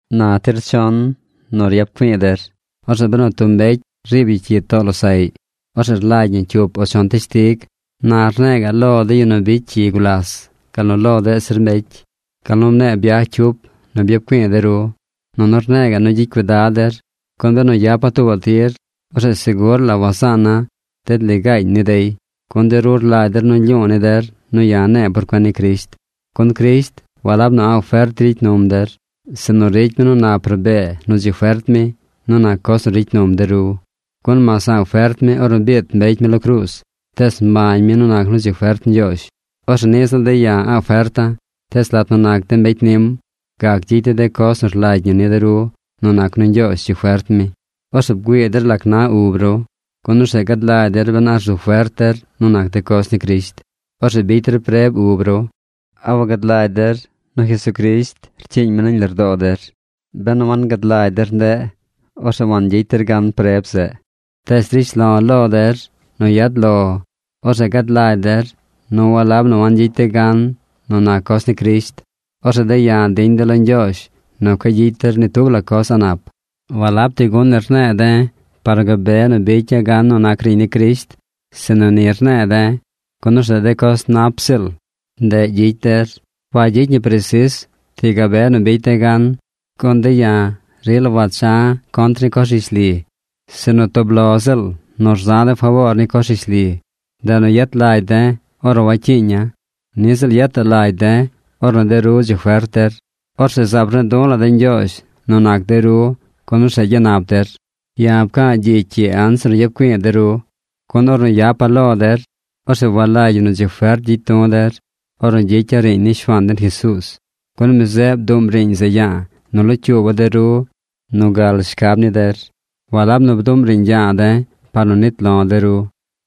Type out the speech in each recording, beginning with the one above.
Na tir chon nu yap güii der. Orzeꞌ benu tub mbecy riib yu cyi too losaꞌy, orzeꞌ rlagy ñi cyup o chon teshtig. Na rne̱e̱ ga̱ꞌ lo de yu nu bicy cyi gulas gal nu lo deꞌ zir mbecy, gal nu mne̱e̱ byaj cyup nu byap güi̱i̱ de ru. Nunu rne̱e̱ ga̱ꞌ nu gyicy cuidad der, gun benu yapa̱ tuubaꞌ tir, orzeꞌ segur la wazaana̱ ded ligaañ ni dey, gun de ru rlagy der nu lyu̱u̱ ni der nu ya̱ ne̱e̱ por cuen ni Crisht. Gun Crisht walab nu a̱ꞌ fert ricy num der, sinu ricy mi nu nap rabee nu dzi fert mi nu nac coz nu ricy num de ru. Gun mas a̱ꞌ fert mi ornu biit mbecy mi lo cruuz, tees mbañ mi nu nac nu dzi fert Ñgyoozh. Orzeꞌ niꞌ ziꞌl de̱ ya̱ a̱ꞌ ferta̱, tees lat nu nac de̱ mbecy nim, gac gyicy de̱ de coz nu rlagy ñi ni de ru nu nac nu Ñgyoozh dzi fert mi. Orzeꞌ bgüii der lac na ub ru, gun orzeꞌ gad lagy der ben a rzu fert der nu nac de coz ni Crisht. Orzeꞌ bicy der preb ub ru. ¿A wagad lagy der nu Jesucrisht cyiiñ mi nañ lardoo der? ¡Benu wagad lagy der ndeꞌ, orzeꞌ wangyicy der gan preb zeꞌ! Tees drish lo̱ lo der nu yad lo orzeꞌ gad lagy der nu walab nu wangyicy de̱ gan nu nac coz ni Crisht. Orzeꞌ de̱ ya̱ diñ de̱ lo Ñgyoozh nu cueꞌ gyicy der ni tub la coz a̱ꞌ nap. Walab ti gun ni rne̱e̱ de̱ par nu gabe nu bicya̱ gan nu nac riiñ ni Crisht, sinu ni rne̱e̱ de̱ gun orzeꞌ de coz nap ziꞌl, ndeꞌ gyicy der. Wagyicy ñi presis ti gabe nu bicy de̱ gan. Gun de̱ ya̱ rila wacha̱ contr ni coz rishli, sinu tub lo ziꞌl nu rza̱ de̱ faboor ni coz rishli. Ndeꞌ nu yet lagy de̱ ornu wacyiiña̱. Niꞌ ziꞌl yetaꞌ lagy de̱ ornu de ru dzi fert der. Orzeꞌ zaab rne̱e̱ du̱ la̱ de̱ Ñgyoozh nu nac de ru gun orzeꞌ gyanap der. Ya̱ pca̱a̱ gyicy ii anzir nu yap güi̱i̱ de ru, gun ornu yapa̱ lo der, orzeꞌ walagy ñi nu dzi fert gyicy du̱ der ornu gyicya̱ riiñ ni Shuaan den Jesuuz. Gun mi zeꞌ bduꞌm riiñ zeꞌ ya̱a̱ nu locyuuba̱ de ru nu gal shcab ni der. Walab nu bduꞌm riiñ ya̱a̱ de̱ par nu nit lo̱ de ru.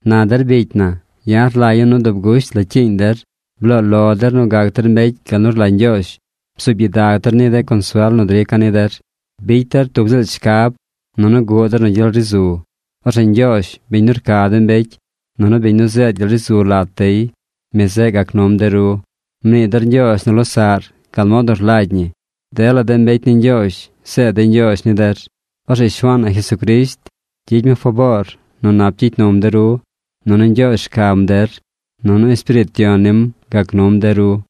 Na der bicy na, ya̱ rlagya̱ nu dub gusht la cyiiñ der. Bloo lo der nu gac der mbecy gal nu rlagy Ñgyoozh. Bzuub gyidag der ni de consuel nu drica̱ ni der. Bicy der tub ziꞌl shcab. Nunu guꞌ der nu gyel ri zu. Orzeꞌ Ñgyoozh, biñ nu rca de mbecy, nunu biñ nu zeed gyel ri zu lat dey, mi zeꞌ gac num de ru. Mnii der ñgyoozh nu losaꞌr gal mod nu rlagy ñi. Dela de mbecy ni Ñgyoozh zeed dey ñgyoozh ni der. Orzeꞌ Shuaan na Jesucrisht gyicy mi faboor nu nap gyicy num de ru. Nunu Ñgyoozh rcam der. Nunu Espiriit Yon nim gac num de ru.